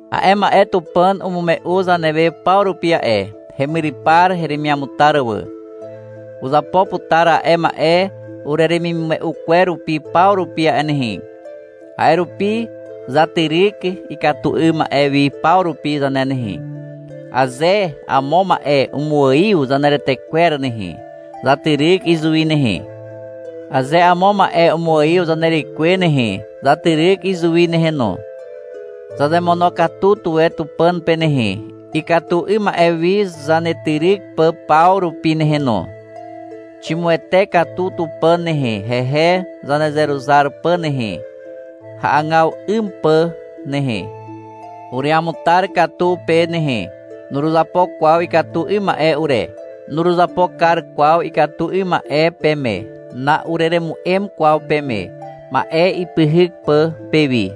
A'e ma'e Tupàn umume'u zanewe paw rupi a'e, hemyrypar heremiamutar wà. Uzapo putar a'e ma'e ureremimume'u kwer rupi paw rupi a'e nehe. A'e rupi zatyryk ikatu 'ym ma'e wi paw rupi zane nehe. Aze amo ma'e umuaiw zaneretekwer nehe, zatyryk izuwi nehe. Aze amo ma'e umuaiw zanerekwe nehe, zatyryk izuwi nehe no. Zazemonokatu tuwe Tupàn pe nehe, ikatu 'ym ma'e wi zanetyryk pà paw rupi nehe no. Ximuwete katu Tupàn nehe, hehe zanezeruzar pà nehe, hagaw 'ym pà nehe. Ureamutar katu pe nehe. Nuruzapo kwaw ikatu 'ym ma'e ure. Nuruzapo kar kwaw ikatu 'ym ma'e peme. Na'ureremu'em kwaw peme, ma'e ipyhyk pà pewi.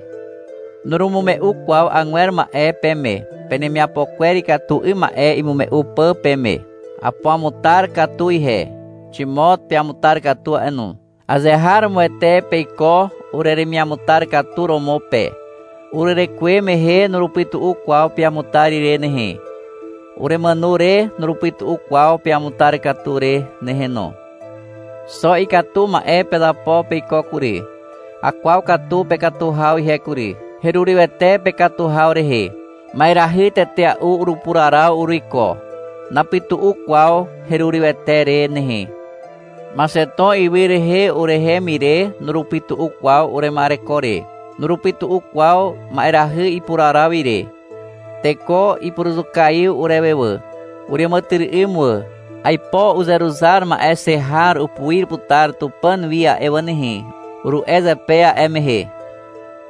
Nurumume'u kwaw agwer ma'e peme, penemiapo kwer ikatu 'ym ma'e imume'u pà peme. Apuamutar katu ihe. Ximot peamutar katu a'e no. Azeharomoete peiko ureremiamutar katu romo pe. Urerekuwe mehe nurupytu'u kwaw peamutar ire nehe. Uremàno re nurupytu'u kwaw peamutar katu re nehe no. Xo ikatu ma'e pezapo peiko kury. Akwaw katu pekatu haw ihe kury. Herurywete pekatu haw rehe. Ma'erahy tetea'u urupuraraw uruiko. Napytu'u kwaw herurywete re nehe. Maxeton ywy rehe urehem ire nurupytu'u kwaw urema'ereko re. Nurupytu'u kwaw ma'erahy ipuraraw ire. Teko ipuruzukaiw urewe wà. Ureàmàtyry'ym wà. — Aipo uzeruzar ma'e xe har upuir putar Tupàn wi a'e wà nehe, uru'e zepe a'e mehe.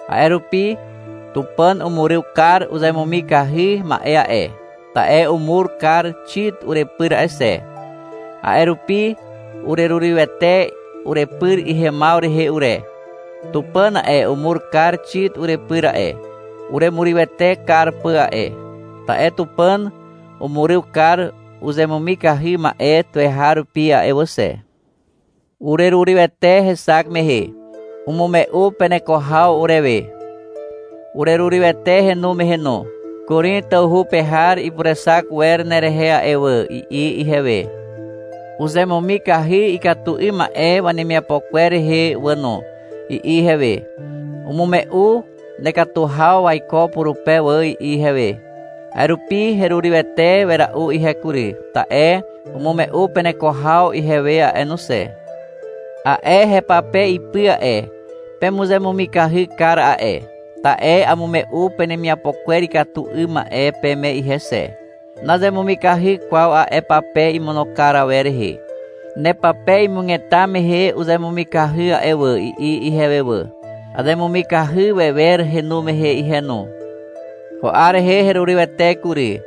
A'e rupi, Tupàn umuryw kar uzemumikahy ma'e a'e, ta'e umur kar Xit urepyr a'e xe. A'e rupi urerurywete urepyr ihemaw rehe ure. Tupàn a'e, umur kar Xit urepyr a'e, uremurywete kar pà a'e, ta'e Tupàn umuryw kar uzemumikahy ma'e tuweharupi a'e wà xe. Urerurywete hexak mehe. Umume'u peneko haw urewe. Urerurywete henu mehe no. — Korin tawhu pe har ipurexak wer nerehe a'e wà, i'i ihewe. — Uzemumikahy ikatu 'ym ma'e wemiapo kwer rehe wà no, i'i ihewe. — Umume'u nekatu haw waiko purupe wà, i'i ihewe. A'e rupi herurywete wera'u ihe kury, ta'e umume'u peneko haw ihewe a'e no xe. A'e hepape ipy a'e, pemuzemumikahy kar a'e, ta'e amume'u penemiapo kwer ikatu 'ym ma'e peme ihe xe. Nazemumikahy kwaw a'e pape imono kar awer rehe. — Nepape imugeta mehe uzemumikahy a'e wà, i'i ihewe wà. Azemumikahy wewer henu mehe ihe no. Ko 'ar rehe herurywete kury.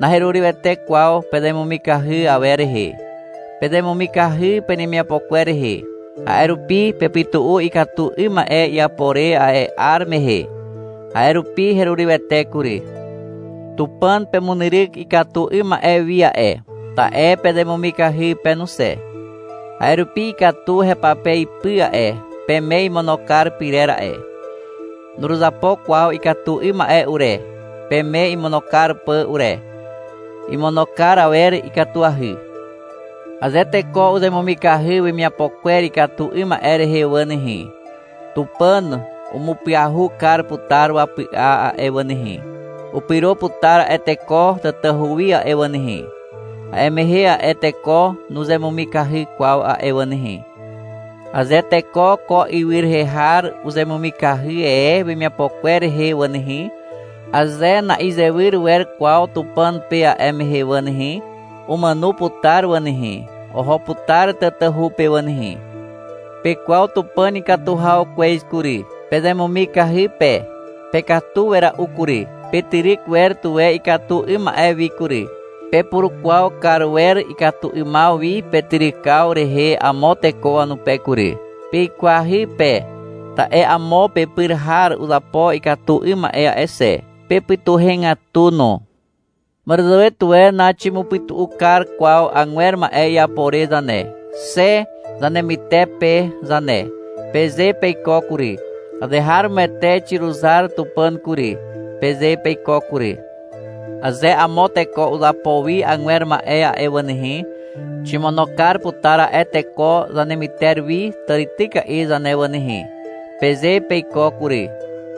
Naherurywete kwaw pezemumikahy awer rehe. Pezemumikahy penemiapo kwer rehe. A'e rupi pepytu'u ikatu 'ym ma'e iapo re a'e 'ar mehe. A'e rupi herurywete kury. Tupàn pemunyryk ikatu 'ym ma'e wi a'e, ta'e pezemumikahy pe no xe. A'e rupi ikatu hepape ipy a'e, peme imono kar pyrer a'e. Nuruzapo kwaw ikatu 'ym ma'e ure, peme imono kar pà ure. Imono kar awer ikatuahy. Aze teko uzemumikahy wemiapo kwer ikatu 'ym ma'e rehe wà nehe, Tupàn umupyahu kar putar wapy'a a'e wà nehe. Upyro putar a'e teko tatahu wi a'e wà nehe. A'e mehe a'e teko nuzemumikahy kwaw a'e wà nehe. Aze teko ko ywy rehe har uzemumikahy e wemiapo kwer rehe wà nehe, aze na'izewyr wer kwaw Tupàn pe a'e mehe wà nehe, umàno putar wà nehe, (oho putar tatahu pe wà nehe). Pekwaw Tupàn ikatu haw kwez kury. Pezemumikahy pe. Pekatu wera'u kury. Petyryk wer tuwe ikatu 'ym ma'e wi kury. Pepurukwaw kar wer ikatu 'ymaw wi petyrykaw rehe amo teko wanupe kury. Peikwahy pe, ta'e amo pepyr har uzapo ikatu 'ym ma'e a'e xe. Pepytuhegatu no. — Màràzàwe tuwe naximupytu'u kar kwaw agwer ma'e iapo re zane, xe zanemytepe zane, peze peiko kury. — Azeharomoete xiruzar Tupàn kury, peze peiko kury. — Aze amo teko uzapo wi agwer ma'e a'e wà nehe, ximono kar putar a'e teko zanemyter wi tàrityka'i zane wà nehe, peze peiko kury.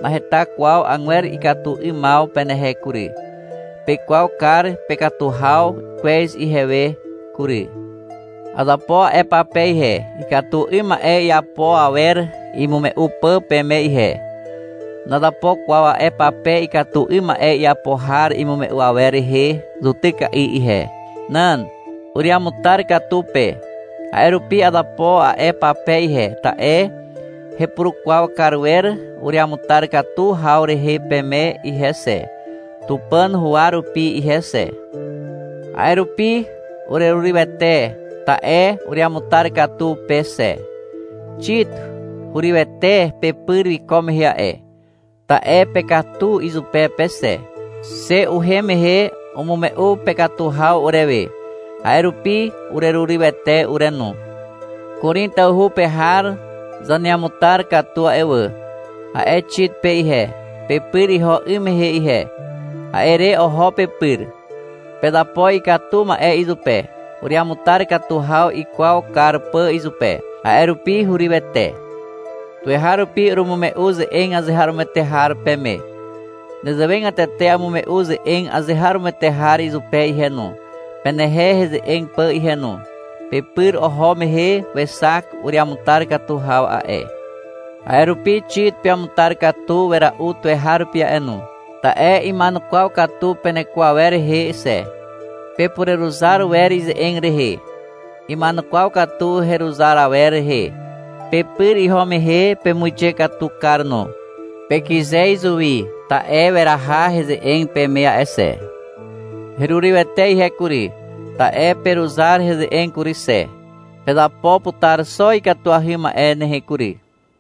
Naheta kwaw agwer ikatu 'ymaw penehe kury. Pekwaw kar pekatu haw kwez ihewe kury. Azapo a'e pape ihe, ikatu 'ym ma'e iapo awer imume'u pà peme ihe. Nazapo kwaw a'e pape ikatu 'ym ma'e iapo har imume'u awer rehe zutyka'i ihe. Nan. Ureamutar katu pe. A'e rupi azapo a'e pape ihe, ta'e hepurukwaw kar wer ureamutar katu haw rehe peme ihe xe, Tupàn huwa rupi ihe xe. A'e rupi urerurywete, ta'e ureamutar katu pe xe. Xit hurywete pepyr wiko mehe a'e, ta'e pekatu izupe pe xe. Xe uhem mehe umume'u pekatu haw urewe, a'e rupi urerurywete ure no. — Korin tawhu pe har zaneamutar katu a'e wà, a'e Xit pe ihe, pepyr iho 'ym mehe ihe. A'e re oho pepyr. Pezapo ikatu ma'e izupe, ureamutar katu haw ikwaw kar pà izupe. A'e rupi herurywete. Tuweharupi urumume'u ze'eg azeharomoete har peme. Nezewegatete amume'u ze'eg azeharomoete har izupe ihe no, penehe heze'eg pà ihe no. Pepyr oho mehe wexak ureamutar katu haw a'e. A'e rupi Xit peamutar katu wera'u tuweharupi a'e no. Ta'e ima'enukwaw katu peneko awer rehe xe. Pepureruzar wer ize'eg rehe. Ima'enukwaw katu heruzar awer rehe. Pepyr iho mehe pemuixe katu kar no. Pekyze izuwi, ta'e weraha heze'eg peme a'e xe. Herurywete ihe kury, ta'e peruzar heze'eg kury xe. Pezapo putar xo ikatuahy ma'e nehe kury.